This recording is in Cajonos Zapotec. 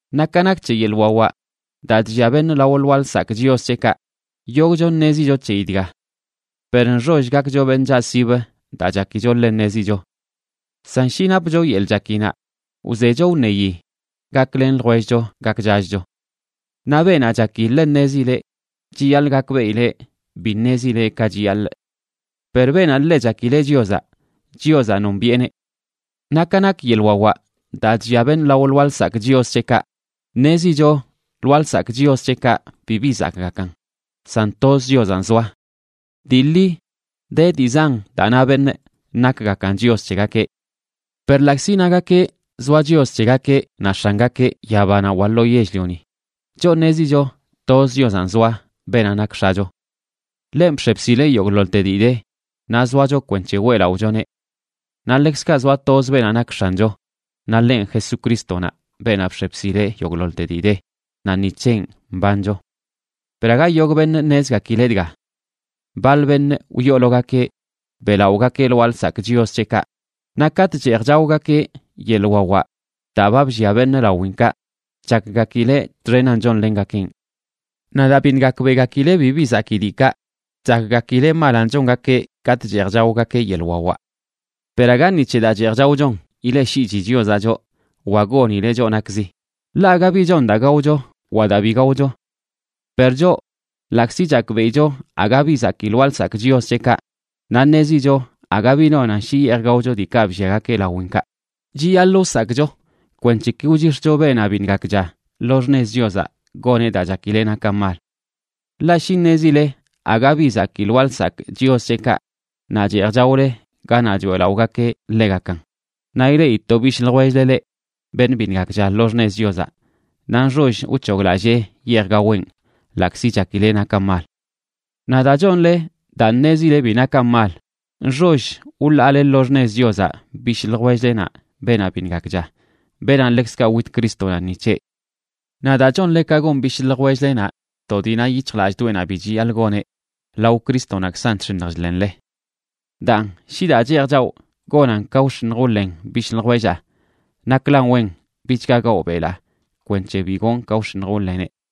Naꞌ ka nak c̱he yeḻꞌ wawaꞌ daa chllia beṉꞌ lao lwaa lsakꞌ chios c̱heꞌkaꞌ, yogꞌcho ṉezicho c̱heyi dga. Per nxoll gakcho beṉꞌ chaꞌsib daa chakicho ḻe ṉezicho. San shi napcho yeḻꞌ chakinaꞌ, wzecho wṉeyi gaklen ljwellcho gakchachcho. Naꞌ beenaꞌ chaki ḻe ṉezileꞌ, chiyaḻꞌ gakbeꞌileꞌ bi ṉezileꞌ ka chiyaḻꞌ. Per beenaꞌ ḻe chakileꞌ Chiozaꞌ, Chiozaꞌ nombiꞌeneꞌ. Naꞌ ka nak yeḻꞌ wawaꞌ daa chllia beṉꞌ lao lwaa lsakꞌ chios c̱heꞌkaꞌ, ṉezicho lwaa lsakꞌ chios c̱heꞌkaꞌ bibi zakꞌgakan, san toz Chiozanꞌ zoa. Dii ḻi de dii zan daa na beṉꞌ nakgakan chios c̱hegakeꞌ. Per ḻaꞌkzi nagakeꞌ zoa chios c̱hegakeꞌ naꞌ x̱angakeꞌ yabanaꞌ wa lo yell-lioni, choꞌ ṉezicho toz Chiozanꞌ zoa, beenaꞌ nak X̱acho. Ḻenꞌ bx̱e bsil yogꞌḻoḻte dii de, naꞌ zoacho kwenc̱he weꞌlaꞌochoneꞌ. Naꞌ ḻekzkaꞌ zoa toz beenaꞌ nak X̱ancho, naꞌ ḻenꞌ Jesucrístonaꞌ, beenaꞌ bx̱e bsileꞌ yogꞌḻoḻte dii de, naꞌ ni c̱henꞌ mbancho. Per aga yogꞌ beṉꞌ ṉezgakileꞌ dga. Baḻ beṉꞌ wyoologakeꞌ beꞌlaꞌogakeꞌ lwaa lsakꞌ chios c̱heꞌkaꞌ, naꞌ katꞌ cheej chaogakeꞌ yeḻꞌ wawaꞌ daa ba bllia beṉꞌ lawinkaꞌ chakgakileꞌ txenan chonlengakeꞌn. Naꞌ daa biṉꞌ gakbeꞌgakileꞌ bibi zakii diikaꞌ, chakgakileꞌ malanꞌ chongakeꞌ katꞌ cheej chaogakeꞌ yeḻꞌ wawaꞌ. Per aga ni c̱he daa cheej chaochon ileꞌshiꞌchi Chiozaꞌ choꞌ wa gonileꞌ choꞌ nakzi; ḻaꞌ aga bi chon daa gaocho wa daa bi gaocho. Per choꞌ, ḻaꞌkzi chakbeꞌicho aga bi zakii lwaa lsakꞌ chios c̱heꞌkaꞌ naꞌ ṉezicho aga bi nonan shi yeej gaocho diikaꞌ blliagakeꞌ lawinkaꞌ, chiyaḻꞌ wsakꞌcho kwenc̱he ki wchix̱cho beenaꞌ biṉꞌ gakcha lo xṉez Chiozaꞌ goneꞌ daa chakileꞌ nakan mal. Ḻaꞌ shi ṉezile aga bi zakii lwaa lsakꞌ chios c̱heꞌkaꞌ naꞌ cheej chaole ganaꞌ choeꞌlaꞌogakeꞌ ḻegakan, naꞌ ileꞌi to bishꞌ ljwell-le leꞌ, beṉꞌ biṉꞌ gakcha lo xṉez Chiozaꞌ, naꞌ nxoll wc̱hoglallee yeej gaweꞌn, ḻaꞌkzi chakileꞌ nakan mal. Naꞌ daa chonle daa ṉezile bi nakan mal, nxoll wḻaale lo xṉez Chiozaꞌ bishꞌ ljwell-lenaꞌ beenaꞌ biṉꞌ gakcha, beenaꞌ ḻekzkaꞌ wit Crístonaꞌ ni c̱heꞌ. Naꞌ daa chonle ka gon bishꞌ ljwell-lenaꞌ to dii na yic̱hjlallꞌdoꞌenaꞌ bi chiyaḻꞌ goneꞌ, lao Crístonaꞌkzan chx̱iṉj chḻenle. Daan shi daa cheej chawꞌ gonan ka wx̱iṉj wḻen bishꞌ ljwellaa, naklan wen bichga gawꞌ belaa, kwenc̱he bi gonꞌ ka wx̱iṉj wḻeneꞌ.